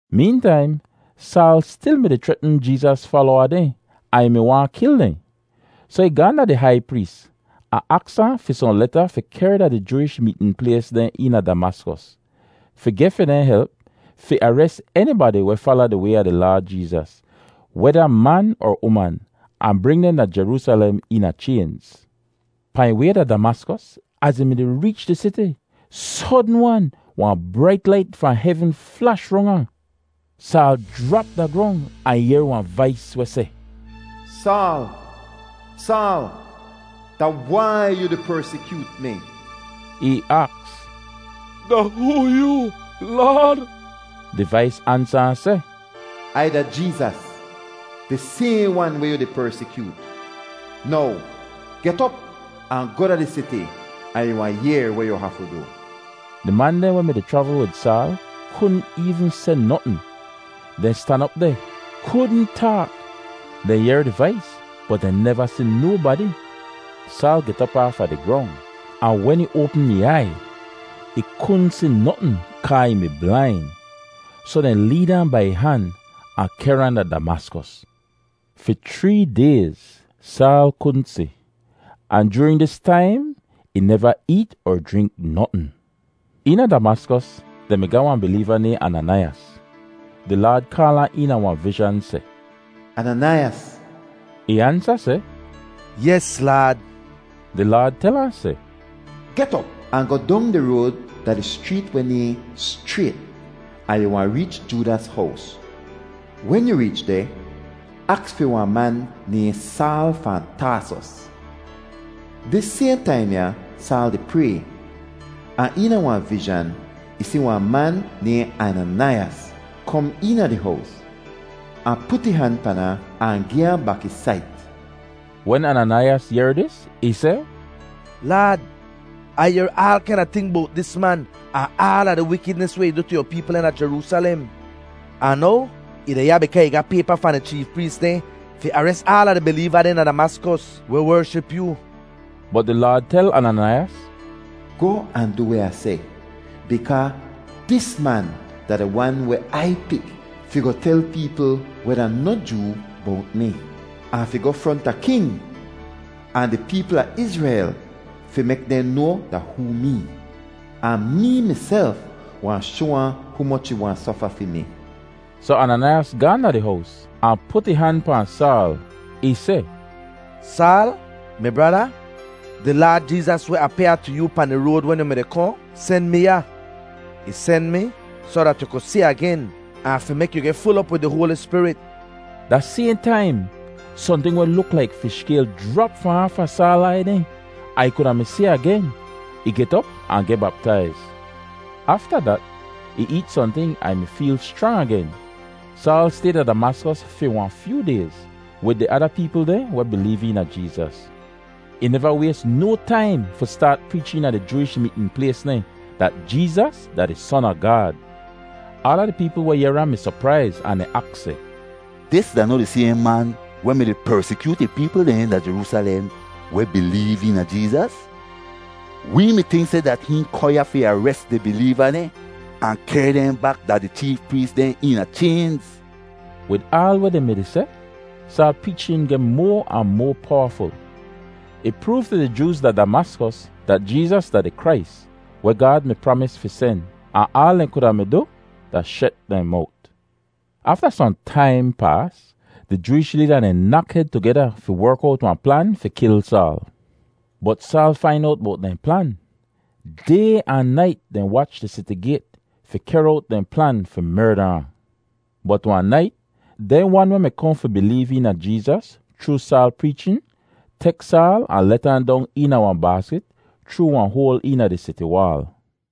Meentaim, Saal stil mi-di chretn Jeezas falowa dehn ahn ih mi waahn kil dehn. Soh ih gaahn da di hai prees, ahn aks ahn fi sohn leta fi kehr da di Jooish meetn plays dehn eena Damaskos, fi geh fi dehn help fi ares enibadi weh fala di Way a di Laad Jeezas, weda man er uman, ahn bring dehn da Jeroosalem eena chaynz. Pahn ih way da Damaskos, az ih mi-di reech di siti, sodn-wan wahn brait lait fahn hevn flash rong ahn! Saal jrap da grong ahn ih yehr wahn vais weh seh, “Saal, Saal, da wai yu di persikyoot mi?” Ih aks, “Da hoo yoo, Laad?” Di vais ansa ahn seh, “Ai da Jeezas, di sayhn wan weh yu di persikyoot. Now get op ahn goh da di siti ahn yu wahn yehr weh yu hafu du.” Di man dehn weh mi-di chravl wid Saal kudn eevn seh notn; dehn stan op deh kudn taak. Dehn yehr di vais bot dehn neva si nobadi. Saal get op aafa di grong, ahn wen ih oapm ih aiy, ih kudn si notn kaa ih mi blain. Soh dehn leed ahn bai ih han ahn kehr ahn da Damaskos. Fi chree dayz Saal kudn si, ahn joorin dis taim ih neva eet er jrink notn. Eena Damaskos dehn mi ga wahn bileeva nayhn Ananaiyas. Di Laad kaal ahn eena wahn vizhan seh, “Ananaiyas!” Ih ansa seh, “Yes, Laad.” Di Laad tel ahn seh, “Get op ahn goh dong di road da di schreet weh nayhn Schrayt ahn yu wahn reech Joodas hows. Wen yu reech deh, aks fi wahn man nayhn Saal fahn Taasos. Dis sayhn taim ya Saal di pray, ahn eena wahn vizhan ih si wahn man nayhn Ananaiyas kom eena di hows, ahn put ih han pan ahn, ahn gi ahn bak ih sait.” Wen Ananaiyas yehr dis, ih seh, “Laad, Ai yehr aal kaina ting bowt dis man ahn aala di wikidnis weh ih du tu yu peepl dehn da Jeroosalem. Ahn now ih deh ya bikaa ih ga paypa fahn di cheef prees dehn fi ares aala di bileeva dehn da Damaskos weh wership yoo!” Bot di Laad tel Ananaiyas, “Goh ahn du weh Ah seh bikaa dis man da di wan weh Ai pik fi goh tel peepl weh da noh Joo bowt mi, ahn fi goh fronta king, ahn di peepl a Izrel fi mek dehn noa da hoo mee. Ahn mee miself wahn shoa ahn humoch ih wahn sofa fi mi.” Soh Ananaiyas gaahn da di hows ahn put ih han pahn Saal. Ih seh, “Saal, mi brada, di Laad Jeezas weh apyaa tu yu pahn di road wen yu mi-di kohn, sen mi ya. Ih sen mi soh dat yu ku si agen ahn fi mek yu geh ful op wid di Hoali Spirit.” Da sayhn taim, sohnting weh luk laik fish skayl jrap fahn aafa Saal aiy dehn, ahn ih kuda mi si agen! Ih get op ahn geh baptaiz. Afta dat ih eet sohnting ahn ih mi feel schrang agen. Saal stay deh da Damaskos fi wahn fyoo dayz wid di ada peepl dehn weh bileev eena Jeezas. Ih neva ways no taim fi staat preech eena di Jooish meetn plays dehn dat Jeezas da di Son a Gaad. Aala di peepl weh yehr ahn mi sopraiz ahn dehn aks seh, “Dis da noh di sayhn man weh mi-di persikyoot di peepl dehn da Jeroosalem weh bileev eena Jeezas? Wee mi tink seh dat hihn kohn ya fi ares di bileeva dehn ahn kehr dehn bak da di cheef prees dehn eena chaynz.” Wid aal weh dehn mi-di seh, Saal preechin geh moa ahn moa powaful. Ih proov tu di Jooz da Damaskos dat Jeezas da di Krais weh Gaad mi pramis fi sen, ahn aal dehn kuda mi du da shet dehn mowt. Afta sohn taim paas, di Jooish leeda dehn nak hed tugeda fi werk owt wahn plan fi kil Saal. Bot Saal fain owt bowt dehn plan. Day ahn nait dehn wach di siti gayt fi kehr owt dehn plan fi merda ahn. Bot wahn nait, dehn wan weh mi kohn fi bileev eena Jeezas chroo Saal preechin tek Saal ahn let ahn dong eena wahn baaskit chroo wahn hoal eena di siti waal.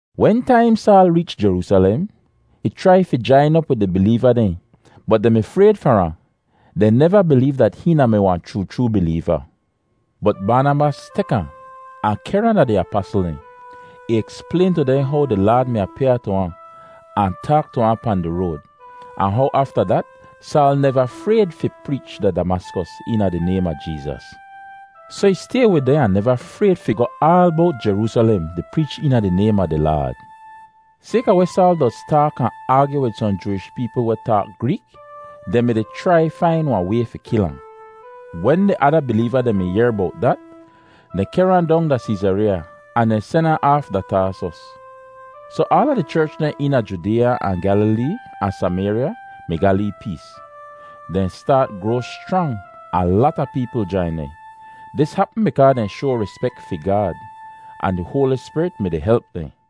Wentaim Saal reech Jeroosalem, ih chrai fi jain op wid di bileeva dehn, bot dehn mi frayd far ahn; dehn neva bileev dat hihn da-mi wahn chroo chroo bileeva. Bot Baanabas tek ahn, ahn kehr ahn da di apasl dehn. Ih eksplayn tu dehn how di Laad mi apyaa tu ahn, ahn taak tu ahn pahn di road, ahn how afta dat Saal neva frayd fi preech da Damaskos eena di naym a Jeezas. Soh ih stay wid dehn ahn neva frayd fi goh aal bowt Jeroosalem di preech eena di naym a di Laad. Sayka weh Saal doz taak ahn aagyu wid sohn Jooish peepl weh taak Greek, dehn mi-di chrai fain wahn way fi kil ahn. Wen di ada bileeva dehn mi yehr bowt dat, dehn kehr ahn dong da Seezareeya ahn dehn sen ahn aaf da Taasos. Soh aala di cherch dehn eena Judeeya ahn Gyalilee ahn Samayrya mi ga lee pees. Dehn staat groa schrang ahn lata peepl jain dehn. Dis hapm bikaa dehn shoa rispek fi Gaad, ahn di Hoali Spirit mi-di help dehn.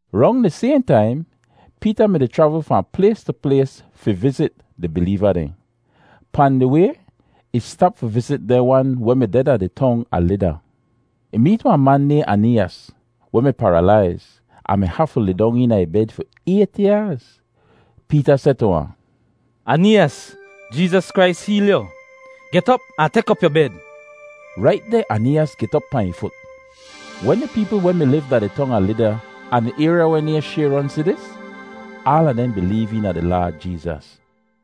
Rong di sayhn taim, Peeta mi-di chravl fahn plays tu plays fi vizit di bileeva dehn. Pahn di way ih stap fi vizit dehn wan weh mi deh da di tong a Lida. Ih meet wahn man nayhn Aneeyas, weh mi paralaiz ahn mi hafu lidong eena ih bed fi ayt yaaz. Peeta seh tu ahn, “Aneeyas, Jeezas Krais heel yu! Get op ahn mek op yu bed.” Rait deh Aneeyas get op pahn ih fut. Wen di peepl weh mi liv da di tong a Lida ahn di ayrya weh nayhn Shayron si dis, aala dehn bileev eena di Laad Jeezas.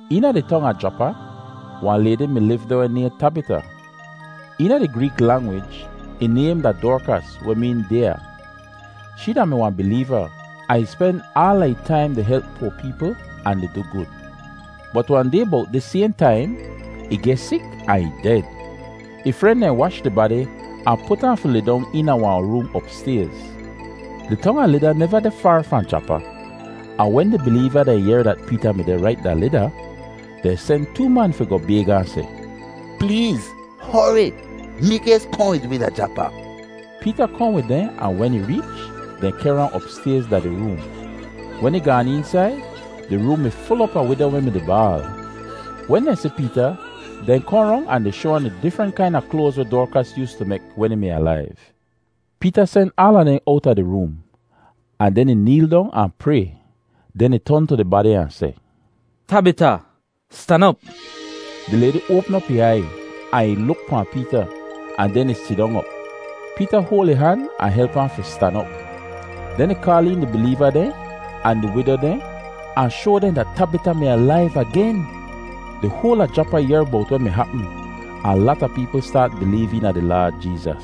Eena di tong a Japa, wahn laydi mi liv deh weh nayhn Tabita. (Eena di Greek langwij ih naym da Dorkas, weh meen “dyaa.”) Shee da-mi wahn bileeva ahn ih spen aala ih taim di help poa peepl ahn di du gud. Bot wahn day bowt dis sayhn taim, ih geh sik ahn ih ded. Ih fren dehn wash di badi ahn put ahn fi lidong eena wahn room opstayz. Di tong a Lida neva deh faar fahn Japa, ahn wen di bileeva dehn yehr dat Peeta mi deh rait da Lida, dehn sen too man fi goh bayg ahn seh, “Pleez hori mikays kohn wid wi da Japa.” Peeta kohn wid dehn ahn wen ih reech, dehn kehr ahn opstayz da di room. Wen ih gaan eensaid, di room mi ful op a wido weh mi-di baal. Wen dehn si Peeta, dehn kohn rong ahn di shoa ahn di difrent kaina kloaz weh Dorkas yoostu mek wen ih mi alaiv. Peeta sen aala dehn owta di room, ahn den ih neel dong ahn pray. Den ih ton tu di badi ahn seh, “Tabita, stan op!” Di laydi oapm ih aiy ahn ih luk pahn Peeta, ahn den ih sidong op. Peeta hoal ih han ahn help ahn fi stan op. Den ih kaal een di bileeva dehn ahn di wido dehn ahn shoa dehn dat Tabita mi alaiv agen! Di hoal a Japa yehr bowt weh mi hapm, ahn lata peepl staat bileev eena di Laad Jeezas.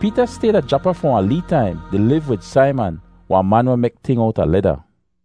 Peeta stay da Japa fi wahn lee taim di liv wid Saiman, wahn man weh mek ting owta leda.